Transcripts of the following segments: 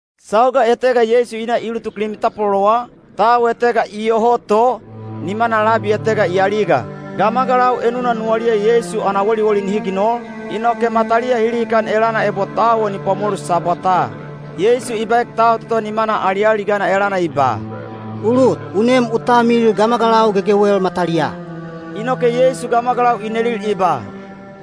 Sauga etega Yeisu i na i ulutuk limi tapwalolowa, tau etega iyoho to, nimana labi etega i aliga. Gamagalau enuna nuwaliya Yeisu ana woliwoli nihi ginol, inoke mataliya hi lihikan elana ebo tau o ni pwamolu Sabwataa. Yeisu i baek tau toto nimana alialigana elana i ba, “U lut, u nem u talmilil gamagalau gegewel mataliyaa.” Inoke Yeisu gamagalau i nelil i ba,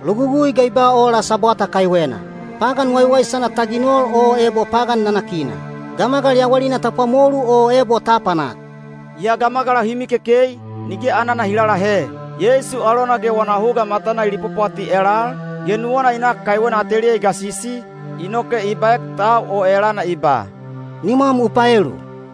“Logugui ga i ba ola Sabwata kaiwena? Pagan waiwaisana ta ginol o ebo pagan nanakina? Gamagal yawalina ta pwamolu o ebo ta apanak?” Yaa gamagalau hi mikekei, nige anana hi lalahe. Yeisu alona ge wana huga matana i lipwapwati elal, ge nuwana i nak kaiwena ateliya i gasisi, inoke i baek tau o elana i ba, “Nimwam u paelu.”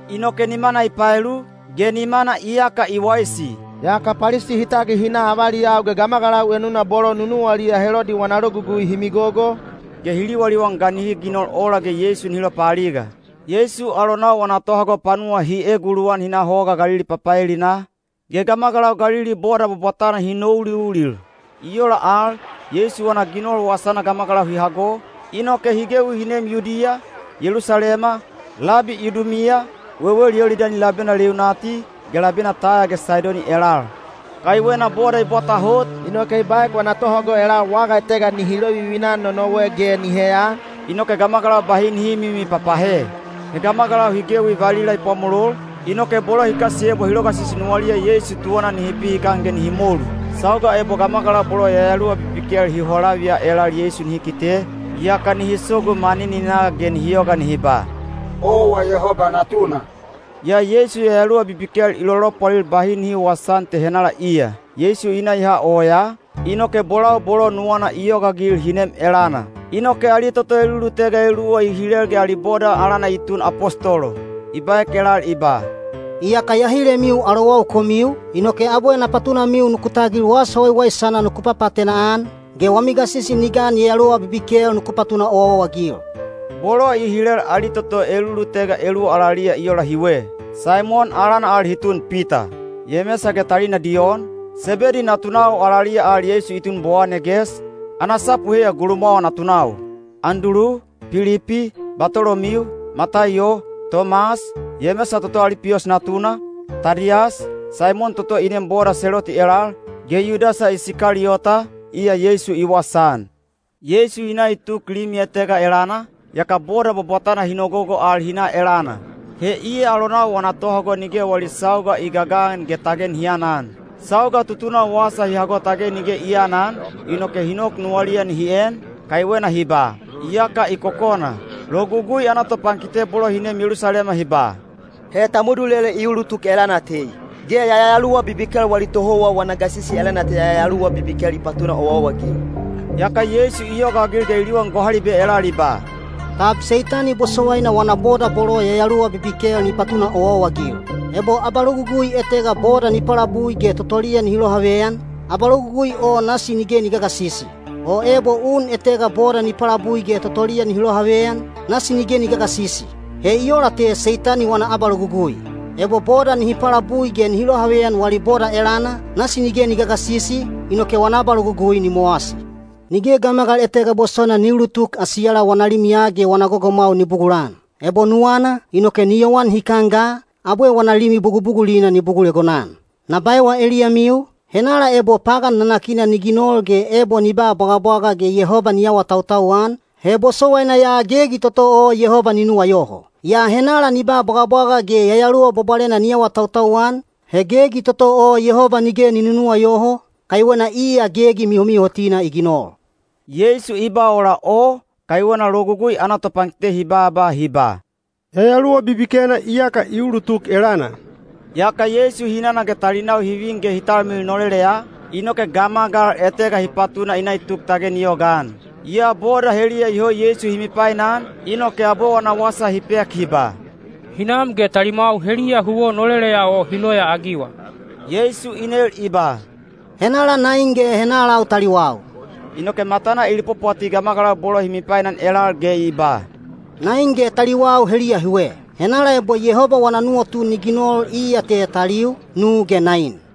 Inoke nimana i paelu, ge nimana iyaka i waisi. Yaka Palisi hi tagil hi na avaliyau ge gamagalau enuna bolo nunuwaliya Helodi wana logugui hi migogo, ge hi liwaliwan ga nihi ginol ola ge Yeisu nihi lopaaliga. Yeisu alonau wana tohago panuwa hi eguluwan hi na Hoga Galili papaelinaa, ge gamagalau Galili boda bwabwatana hi nouliulil. I ola al, Yeisu wana ginol wasana gamagalau hi hago, inoke hi gewi hi neem Yudiya, Yelusalema, labi Idumiya, wewel Yolidani labena leunati, ge labena Taya ge Saidoni elal. Kaiwena boda i bwata hot, inoke i baek wana tohago elal waga etega nihi lovivina-an nonowe ge ni heya, inoke gamagalau bahi nihi mimipapahe. He gamagalau hi gewi valila i pwamolol, inoke bolo hi kasiyebwa hi logasisi nuwaliya Yeisu tuwana nihi pihikan ge nihi molu. Sauga ebo gamagalau bolo yayaluwa bibikel hi holaviya elal Yeisu nihi kite, yaka nihi sogu manininaa ge nihi yoga nihi ba, “Owa Yehoba Natuna.” Yaa Yeisu yayaluwa bibikel i lolopwalil bahi nihi wawasaan te henala iya. Yeisu i na i ha oyaa, inoke bolau bolo nuwana i yogaagil hi nem elana. Inoke ali toto elulutega eluwa i hilel ge ali boda alana i tun apostolo. I baek elal i ba, “Iyaka ya hilemiu alowau komiu, inoke abwe na patunamiu nuku tagil wasa waiwaisana nuku papaatena-an, ge wami gasisi ni gan yayaluwa bibikel nuku patuna owaowa-agil.” Bolo i hilel ali toto elulutega eluwa alaliya i ola hiwe: Saimon (alana al i tun Pita); Yemesa ge talina Diyon, Sebedi natunau (alaliya al Yeisu i tun Bowaneges, ana sapu heiya Gulumwawa Natunau); Andulu, Pilipi, Batolomiu, Mataiyo, Tomas, Yemesa toto Alipiyos natuna, Tadiyas, Saimon toto i neem boda Seloti elal, ge Yudasa Isikaliyota, iya Yeisu i wasaan. Yeisu i na i tuk limi etega elana, yaka boda bwabwatana hi nogogo al hi na elana. He iya alonau wana tohago nige wali sauga i gagan ge tage nihi anan. Sauga tutunau wasa hi hago tage nige i aanan, inoke hi nok nuwaliya nihi en, kaiwena hi ba, “Iyaka i kokona.” Logugui ana topankite bolo hi neem Yelusalema hi ba, “He Tamudulele i ulutuk elana tei. Ge yayaluwa bibikel wali tohouwa wana gasisi elana te yayaluwa bibikel i papatuna owaowa-agil.” Yaka Yeisu i yogaagil ge i liwan gohalibe elal i ba, “Tab Seitani bosowaina wana boda bolo yayaluwa bibikel ni patuna owaowa-agil? Ebo abalogugui etega boda ni palabui ge totoliya nihi lohaveyan, abalogugui o nasi nige ni gagasisi. O ebo un etega boda ni palabui ge totoliya nihi lohaveyan, nasi nige ni gagasisi. He i ola te Seitani wana abalogugui. Ebo boda nihi palabui ge nihi lohaveyan wali boda elana, nasi nige ni gagasisi, inoke wana abalogugui ni mowasi. “Nige gamagal etega bosowaina ni ulutuk asiyala wana limiya ge wana gogomwau ni bugulan. Ebo nuwana, inoke ni yowan hikan ga, abwe wana limi bugubugulina ni bugul egonan. “Na baewa eliyamiu, henala ebo pagan nanakina ni ginol ge ebo ni ba bwagabwaga ge Yehoba ni awatautau-an, he bosowaina ya gegi toto o Yehoba ni nuwayoho. Yaa henala ni ba bwagabwaga ge Yayaluwa Bwabwalena ni awatautau-an, he gegi toto o Yehoba nige ni nunuwayoho, kaiwena iya gegi mihomihotina i ginol.” Yeisu i ba ola o, kaiwena Logugui ana topankite hi baaba hi ba, “Yayaluwa bibikena iyaka i ulutuk elana.” Yaka Yeisu hinana ge talinau hi vin ge hi talmilil noleleya, inoke gamagal etega hi patuna i na i tuk tage ni yogaan. Yaa boda heliya iyoho Yeisu hi mipainan, inoke abwe wana wasa hi pek hi ba, “Hinam ge talimwau heliya huwo noleleya o hi loyaagiwa.” Yeisu i nel i ba, “Henala nain ge henalau taliwau?” Inoke matana i lipwapwati gamagalau bolo hi mipainan elal ge i ba, “Nain ge taliwau heliya hiwe! Henala ebo Yehoba wana nuwatu ni ginol iya te taliu, nu ge nain.”